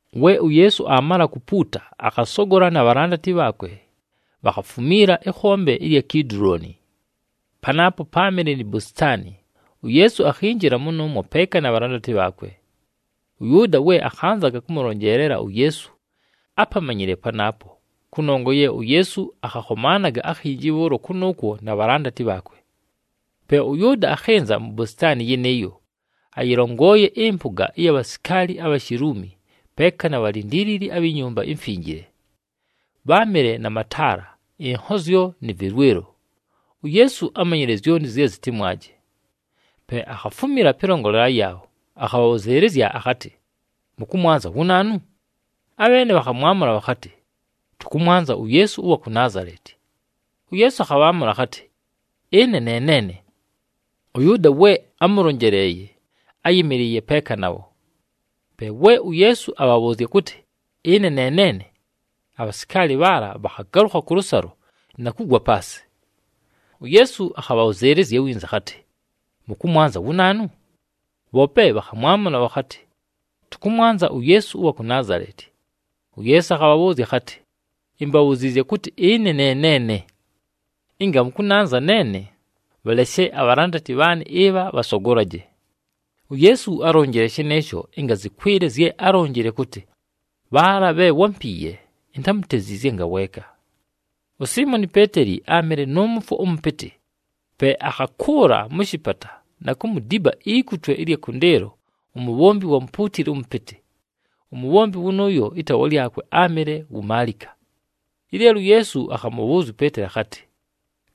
We uYeesu aamala kupuuta, akhasogola na bhalandati bhaakwe, bhakhafumiila ɨkhombe ɨlya Kidulooni. Panaapo páamɨle ni bositaani, uYeesu akhinjila mʉnʉʉmwo peeka na bhalandati bhaakwe. ɄYʉʉda we akhanzaga kʉmʉlonjeelela uYeesu ápamanyile panaapo, kʉnongwa ye uYeesu akhakhomaanaga akhinji bhʉʉlo kʉnʉʉkwo na bhalandati bhaakwe. Pe ʉYʉʉda akhɨnza mu bositaani yɨnɨɨyo, ayɨlongooye ɨmpʉga ɨya bhasikaali abha Shiluumi, peeka na bhalindiilili abhi Nyumba iMfinjile. Bháamɨle na mataala, ɨnhozyo nɨ vɨlwɨlo. UYeesu ámanyile zyonti zye zɨtɨmwaje. Pe akhafumila pɨlongolela yaabho, akhabhabhʉzɨɨlɨzya akhatɨ, “Mʉkʉmwanza wu naanu?” Abheene bhakhamwamʉla bhakhatɨ, “Tʉkʉmwanza uYeesu ʉwa ku Naazaleti.” UYeesu akhabhaamʉla akhatɨ, “Ɨne ne neene.” ɄYʉʉda we ámʉlonjeleeye áyɨmɨlɨɨye peeka nabho. Pe we uYeesu abhabhʉʉzya kʉtɨ, “Ɨne ne neene,” abhasikaali bhaala bhakhagalʉkha kʉlʉsalo na kugwa paasɨ. UYeesu akhabhabhʉzɨɨlɨzya winza akhatɨ, “Mʉkʉmwanza wu naanu?” Bhoope bhakhamwamʉla bhakhatɨ, “Tʉkʉmwanza uYeesu ʉwa ku Naazaleti.” UYeesu akhabhabhʉʉzya akhatɨ, “Imbabhuziizye kʉtɨ ɨne ne neene. Ɨnga mʉkʉnanza neene, bhaleshe abhalandati bhaanɨ ɨbha bhasogolaje.” UYeesu álonjile shɨnɨɨsho ɨnga zɨkwɨle zye álonjile kʉtɨ, “Bhaala bhe wámpiiye intámuteziizye ngaweeka.” USiimoni Peeteli áamɨle nʉ mʉfwo ʉmʉpɨtɨ, pe akhakʉʉla mʉ shɨpata na kumudiba ikutwe ɨlya kʉndɨɨlo umubhombi ʉwa mupuutili ʉmʉpɨtɨ. Umubhombi wʉnʉʉyo ɨtaawa lyakwe áamɨle wu Maalika. Ɨleelo uYeesu akhamʉbhʉʉzya uPeeteli akhatɨ,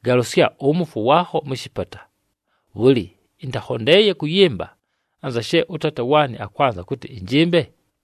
“Galʉsya ʉmʉfwo waakho mʉ shɨpata. Bhʉlɨ, ɨntakhondeeye kʉyɨmba anza she ʉTaata waanɨ akwanza kʉtɨ ɨnjɨmbe?”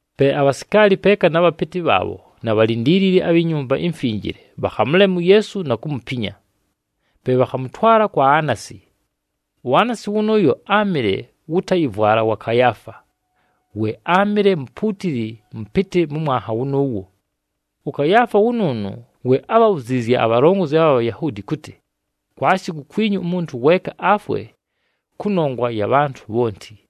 Pe abhasikaali peeka na bhapɨtɨ bhaabho na bhalindiilili abhi Nyumba iMfinjile, bhakhamʉlema uYeesu na kumupinya. Pe bhakhamʉtwala kwa Aanasi. UAanasi wʉnʉʉyo áamɨle wʉ tayɨvwala wa Kayaafa, we áamɨle mupuutili mʉpɨtɨ mʉ mwanha wʉnʉʉwo. ɄKayaafa wʉnʉʉnʉ we ábhabhuziizye abhalongozi abha Bhayahuudi kʉtɨ, “Kwashi kukwinyu umuntu weeka afwe kʉnongwa ya bhantʉ bhonti.”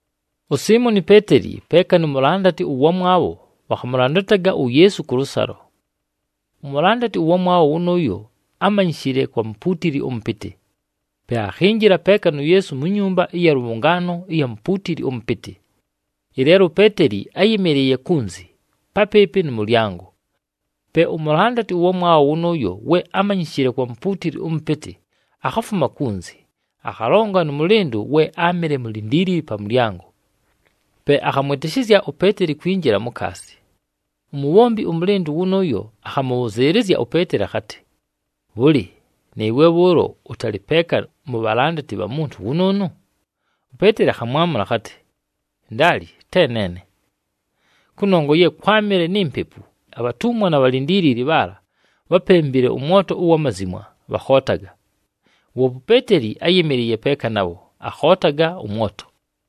USiimoni Peeteli peeka nu mulandati ʉwamwabho bhakhamʉlandataga uYeesu kʉlʉsalo. Umulandati ʉwamwabho wʉnʉʉyo ámanyishile kwa mupuutili ʉmʉpɨtɨ, pe akhinjila peeka nu Yeesu mu nyumba ɨya lʉbhʉngaano ɨya mupuutili ʉmʉpɨtɨ. Ɨleelo uPeeteli áyɨmɨlɨɨye kunzi, papɨɨpɨ nʉ mʉlyango. Pe umulandati ʉwamwabho wʉnʉʉyo we ámanyishile kwa mupuutili ʉmʉpɨtɨ, akhafuma kunzi, akhalonga nʉ mʉlɨndʉ we áamɨle mulindiilili pa mʉlyango. Pe akhamwɨtɨshɨzya uPeeteli kwinjila mukaasi. Umubhombi ʉmʉlɨndʉ wʉnʉʉyo akhamʉbhʉzɨɨlɨzya uPeeteli akhatɨ, “Bhʉlɨ, nɨɨwe bhʉʉlo ʉtalɨ peeka mu bhalandati bha muntu wʉnʉʉnʉ?” UPeeteli akhamwamʉla akhatɨ, “Ndaali, te neene.” Kʉnongwa ye kwámɨle ni mpepu, abhatumwa na bhalindiilili bhaala bhápembile ʉmwoto ʉwa mazimwa, bhakhootaga. Woope uPeeteli áyɨmɨlɨɨye peeka nabho, akhootaga ʉmwoto.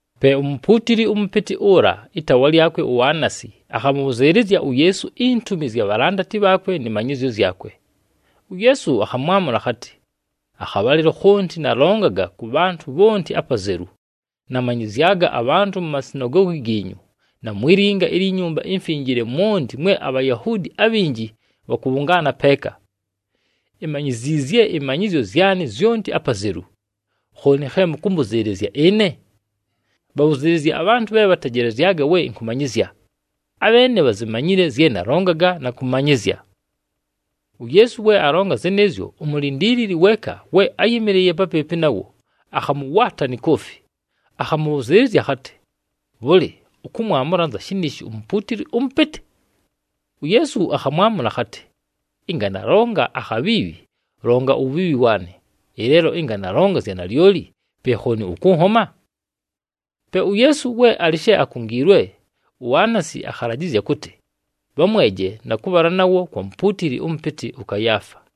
Pe umupuutili ʉmʉpɨtɨ ʉla, ɨtaawa lyakwe uAanasi, akhamʉbhʉzɨɨlɨzya uYeesu intumi zya bhalandati bhaakwe nɨ manyɨzyo zyakwe. UYeesu akhamwamʉla akhatɨ, “Akhabhalɨlo khonti nalongaga kʉ bhantʉ bhonti apazelu, namanyɨzyaga abhantʉ mu masinagoogi giinyu na mwi linga ilyi Nyumba iMfinjile mwonti mwe aBhayahuudi abhinji bhakʉbhʉngaana peeka. Imanyiziizye ɨmanyɨzyo zyanɨ zyonti apazelu. Khooni khe mʉkʉmbʉzɨɨlɨzya ɨne? Bhabhʉzɨɨlɨzye abhantʉ bhe bhantejelezyaga we ɨnkʉmanyɨzya! Abheene bhazimanyile zye nalongaga na kʉmanyɨzya.” UYeesu we alonga zɨnɨɨzyo, umulindiilili weeka we áyɨmɨlɨɨye papɨɨpɨ nawo, akhamʉwaata ni koofi, akhamʉbhʉzɨɨlɨzya akhatɨ, “Bhʉlɨ, ʉkʉmwamʉla anza shɨnɨɨsho umupuutili ʉmʉpɨtɨ?” UYeesu akhamwamʉla akhatɨ, “Ɨnga nalonga akhabhiibhi, longa uwubhiibhi waanɨ. Ɨleelo ɨnga nalonga zya nalyoli, pe khooni ʉkʉnhoma?” Pe uYeesu we alɨ she akungiilwe, uAanasi akhalajɨzya kʉtɨ bhamweje na kʉbhala nawo kwa mupuutili ʉmʉpɨtɨ ʉKayaafa.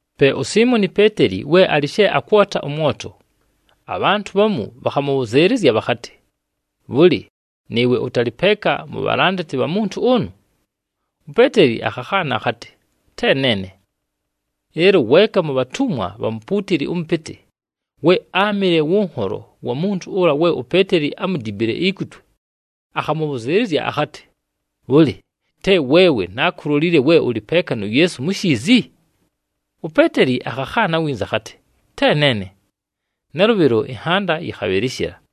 Pe uSiimoni Peeteli we alɨ she akwota ʉmwoto, abhantʉ bhamu bhakhamʉbhʉzɨɨlɨzya bhakhatɨ, “Bhʉlɨ, nɨɨwe ʉtalɨ peeka mu bhalandati bha muntu ʉnʉ?” UPeeteli akhakhaana akhatɨ, “Te neene.” Ɨleelo weeka mu bhatumwa bha mupuutili ʉmʉpɨtɨ, we áamɨle wʉ nholo wa muntu ʉla we uPeeteli ámudibile ikutwe, akhamʉbhʉzɨɨlɨzya akhatɨ, “Bhʉlɨ, te weewe nákulolile we ʉlɨ peeka nu Yeesu mu shiizi?” UPeeteli akhakhaana winza akhatɨ, “Te neene.” Nalʉbhɨlo ɨnhanda yɨkhabhɨlɨshɨla.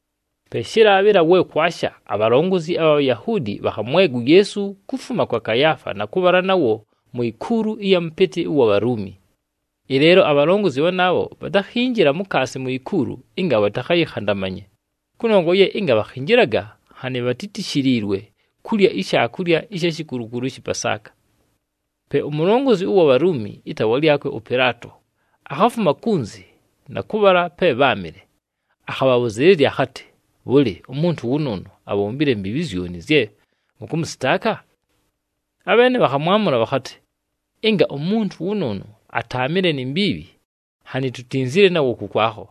Pe shɨlaabhɨla we kwasha, abhalongozi abha Bhayahuudi bhakhamwega uYeesu kufuma kwa Kayaafa na kʉbhala nawo mu ikuulu ɨya mʉpɨtɨ ʉwa Bhaluumi. Ɨleelo abhalongozi bhanaabho bhatakhinjila mukaasi mu ikuulu ɨnga bhatakhayɨkhandamanye, kʉnongwa ye ɨnga bhakhinjilaga nhanɨ bhatítishiliilwe kulya ishaakulya ɨsha shikulukulu ɨshɨ Pasaaka. Pe umulongozi ʉwa Bhaluumi, ɨtaawa lyakwe ʉPɨlaato, akhafuma kunzi na kʉbhala pe bháamɨle, akhabhabhʉzɨɨlɨzya akhatɨ, “Bhʉlɨ, umuntu wʉnʉʉnʉ abhombile mbiibhi zyoni zye mʉkʉmʉsɨtaaka?” Abheene bhakhamwamʉla bhakhatɨ, “Ɨnga umuntu wʉnʉʉnʉ ataamɨle ni mbiibhi, nhanɨ tutinzile nawo kʉkwakho.”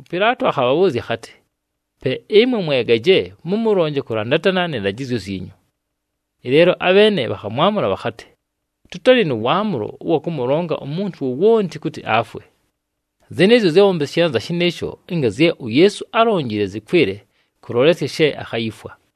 ɄPɨlaato akhabhabhʉʉzya akhatɨ, “Pe ɨmwe mwegaje, mʉmʉlonje kʉlandatana nɨ ndajɨzyo zyinyu.” Ɨleelo abheene bhakhamwamʉla bhakhatɨ, “Tʉtalɨ nʉ waamʉlo ʉwa kʉmʉlonga umuntu wowonti kʉtɨ afwe.” Zɨnɨɨzyo zyábhombeshile anza shɨnɨɨsho, ɨnga zye uYeesu álonjile zɨkwɨle kʉlolesya she akhayifwa.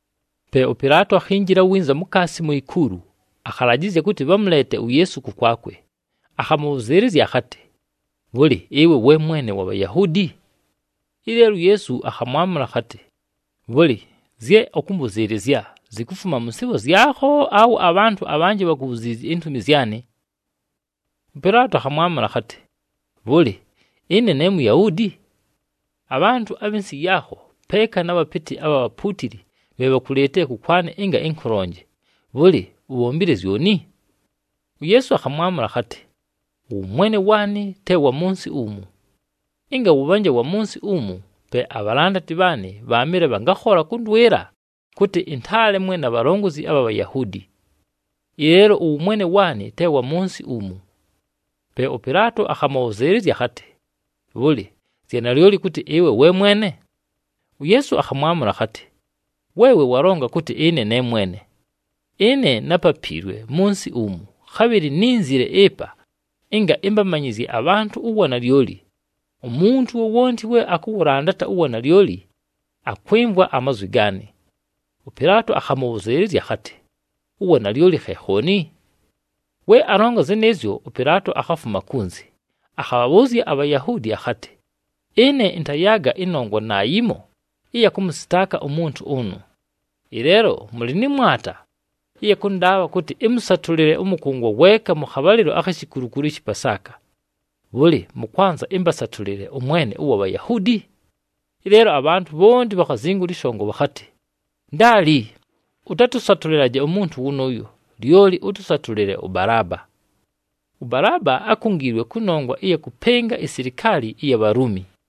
Pe ʉPɨlaato akhinjila winza mukaasi mu ikuulu, akhalajɨzya kʉtɨ bhamʉleete uYeesu kʉkwakwe, akhamʉbhʉzɨɨlɨzya akhatɨ, “Bhʉlɨ, ɨwe we Mwene wa Bhayahuudi?” Ɨleelo uYeesu akhamwamʉla akhatɨ, “Bhʉlɨ, zye ʉkʉmbʉzɨɨlɨzya, zikufuma mʉ nsɨɨbho zyakho awe abhantʉ abhanjɨ bhakubhuziizye intumi zyanɨ?” ɄPɨlaato akhamwamʉla akhatɨ, “Bhʉlɨ, ɨne ne Muyahuudi? Abhantʉ abhɨ nsɨ yaakho peeka na bhapɨtɨ abha bhapuutili bhe bhakuleetile kʉkwanɨ ɨnga ɨnkʉlonje. Bhʉlɨ, ubhombile zyoni?” UYeesu akhamwamʉla akhatɨ, “Ʉwʉmwene waanɨ te wa mʉ nsɨ umu. Ɨnga wʉbhanje wa mʉ nsɨ umu, pe abhalandati bhaanɨ bhaamɨle bhangakhola kʉndwɨlɨla kʉtɨ ɨntaalemwe na bhalongozi abha Bhayahuudi. Ɨleelo ʉwʉmwene waanɨ te wa mʉ nsɨ umu.” Pe ʉPɨlaato akhamʉbhʉzɨɨlɨzya akhatɨ, “Bhʉlɨ, zya nalyoli kʉtɨ ɨwe we mwene?” UYeesu akhamwamʉla akhatɨ, “Weewe walonga kʉtɨ ɨne ne mwene. Ɨne nápapiilwe mʉ nsɨ umu, khabhɨlɨ nínzile ɨpa, ɨnga ɨmbamanyɨzye abhantʉ uwanalyoli. Umuntu wowonti we akʉwʉlandata uwanalyoli, akwɨmvwa amazwi gaanɨ.” ɄPɨlaato akhamʉbhʉzɨɨlɨzya akhatɨ, “Uwanalyoli khe khooni?” We alonga zɨnɨɨzyo, ʉPɨlaato akhafuma kunzi, akhabhabhʉʉzya aBhayahuudi akhatɨ, “Ɨne ɨntayaaga ɨnongwa naayimo ɨya kʉmʉsɨtaaka umuntu ʉnʉ. Ɨleelo mʉlɨ nɨ mwata ɨya kʉndaabha kʉtɨ ɨmʉsatʉlɨle ʉmʉkʉngwa weeka mʉ khabhalɨlo akhi shikulukulu ɨshɨ Pasaaka. Bhʉlɨ, mʉkwanza ɨmbasatʉlɨle ʉMwene ʉwa Bhayahuudi?” Ɨleelo abhantʉ bhonti bhakhazingula ɨshongo bhakhatɨ, “Ndaali! Ʉtatʉsatʉlɨlaje umuntu wʉnʉʉyo, lyoli ʉtʉsatʉlɨle ʉBalaaba.” ɄBalaaba ákungiilwe kʉnongwa ɨya kʉpɨnga isilikaali ɨya Bhaluumi.